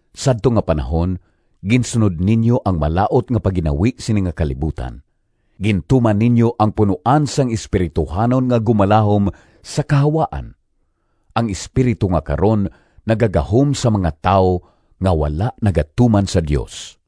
Sadto nga panahon ginsunod ninyo ang malaut nga pagginawi sini nga kalibutan; gintuman ninyo ang punoan sang espirituhanon nga gumalahom sa kahawaan, ang espiritu nga karon nagagahom sa mga tawo nga wala nagatuman sa Dios.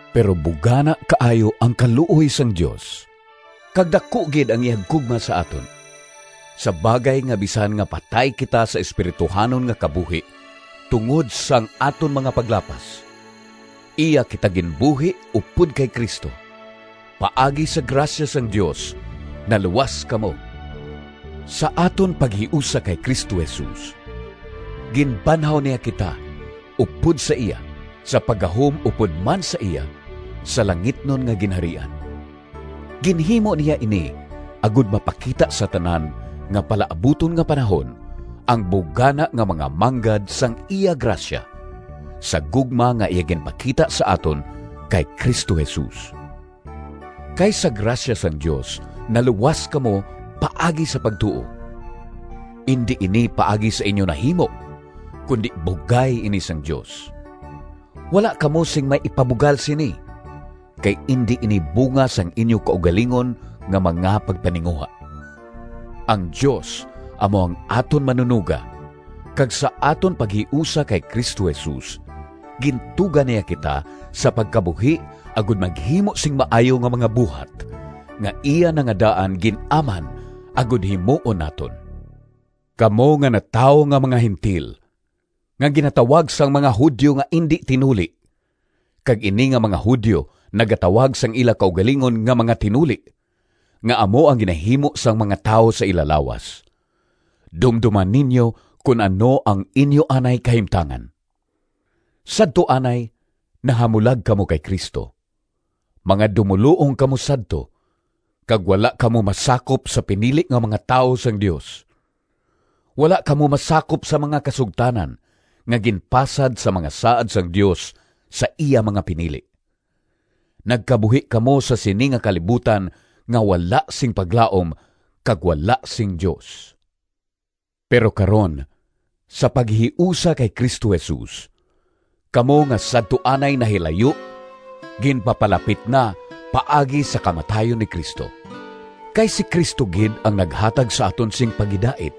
Pero bugana kaayo ang kaluoy sang Dios, kag daku gid ang iya gugma sa aton, sa bagay nga bisan nga patay kita sa espirituhanon nga kabuhi tungod sang aton mga paglapas, iya kita ginbuhi upod kay Cristo. Paagi sa grasya sang Dios naluwas kamo. Sa aton paghiusa kay Cristo Jesus ginbanhaw niya kita upod sa iya sa paggahom upod man sa iya sa langitnon nga ginharian. Ginhimo niya ini agod mapakita sa tanan nga palaabuton nga panahon ang bugana nga mga manggad sang iya grasya, sa gugma nga iya ginpakita sa aton kay Cristo Jesus. Kay sa grasya sang Dios naluwas kamo paagi sa pagtuo. Indi ini paagi sa inyo nahimo, kundi bugay ini sang Dios. Wala kamo sing may ipabugal sini, kay indi ini bunga sang inyo kaugalingon nga mga pagpaninguha. Ang Dios amo ang aton Manunoga, kag sa aton paghiusa kay Cristo Jesus gintuga niya kita sa pagkabuhi agod maghimo sing maayo nga mga buhat, nga iya na nga daan gin-aman agod himuon naton. Kamo nga natawo nga mga Gentil—nga ginatawag sang mga Judio nga indi tinuli, kag ini nga mga Judio nagatawag sang ila kaugalingon nga mga tinuli (nga amo ang ginahimo sang mga tawo sa ila lawas)—dumdoma ninyo kon ano ang inyo anay kahimtangan. Sadto anay nahamulag kamo kay Cristo. Mga dumoluong kamo sadto, kag wala kamo masakop sa pinili nga mga tawo sang Dios. Wala kamo masakop sa mga kasugtanan, nga ginpasad sa mga saad sang Dios sa iya mga pinili. Nagkabuhi kamo sa sini nga kalibutan nga wala sing paglaom kag wala sing Dios. Pero karon, sa paghiusa kay Cristo Jesus, kamo nga sadto anay nahilayo ginpapalapit na paagi sa kamatayon ni Cristo. Kay si Cristo gid ang naghatag sa aton sing paghidait,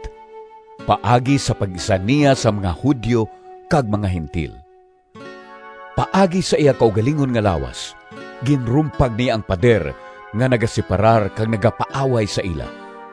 paagi sa pag-isa niya sang mga Judio kag mga Gentil. Paagi sa iya kaugalingon nga lawas ginrumpag niya ang pader nga nagaseparar kag nagapaaway sa ila.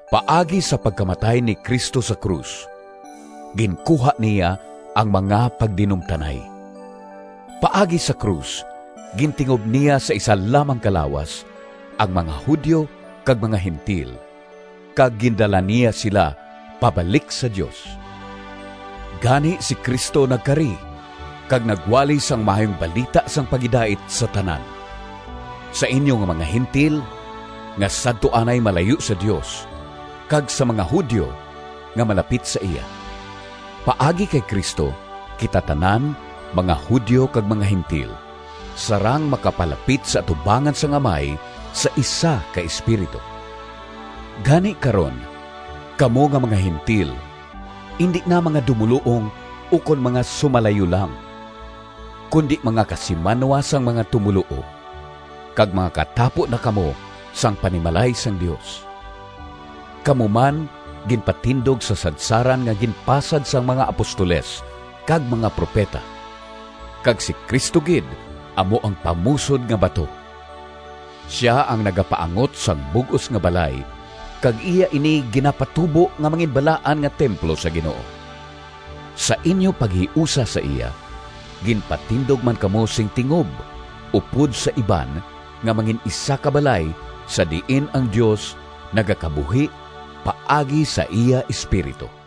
Paagi sa pagkamatay ni Cristo sa krus ginkuha niya ang mga pagdinumtanay. Paagi sa krus gintingob niya sa isa lamang ka lawas ang mga Judio kag mga Gentil, kag gindala niya sila pabalik sa Dios. Gani si Cristo nagkari kag nagwali sang Maayong Balita sang paghidait sa tanan: sa inyo nga mga Gentil, nga sadto anay malayo sa Dios, kag sa mga Judio, nga malapit sa iya. Paagi kay Cristo kita tanan, mga Judio kag mga Gentil, sarang makapalapit sa atubangan sang Amay sa isa ka Espiritu. Gani karon, kamo nga mga Gentil indi na mga dumoluong ukon mga sumalayo lang, kundi mga kasimanwa sang mga tumoluo, kag mga katapo na kamo sang panimalay sang Dios. Kamo man ginpatindog sa sadsaran nga ginpasad sang mga apostoles kag mga propeta, kag si Cristo Jesus gid amo ang pamusod nga bato. Sia ang nagapaangot sang bug-os nga balay kag iya ini ginapatubo nga manginbalaan nga templo sa Ginoo. Sa inyo paghiusa sa iya, ginpatindog man kamo sing tingob upod sa iban nga mangin-isa ka balay sa diin ang Dios nagakabuhi paagi sa iya Espiritu.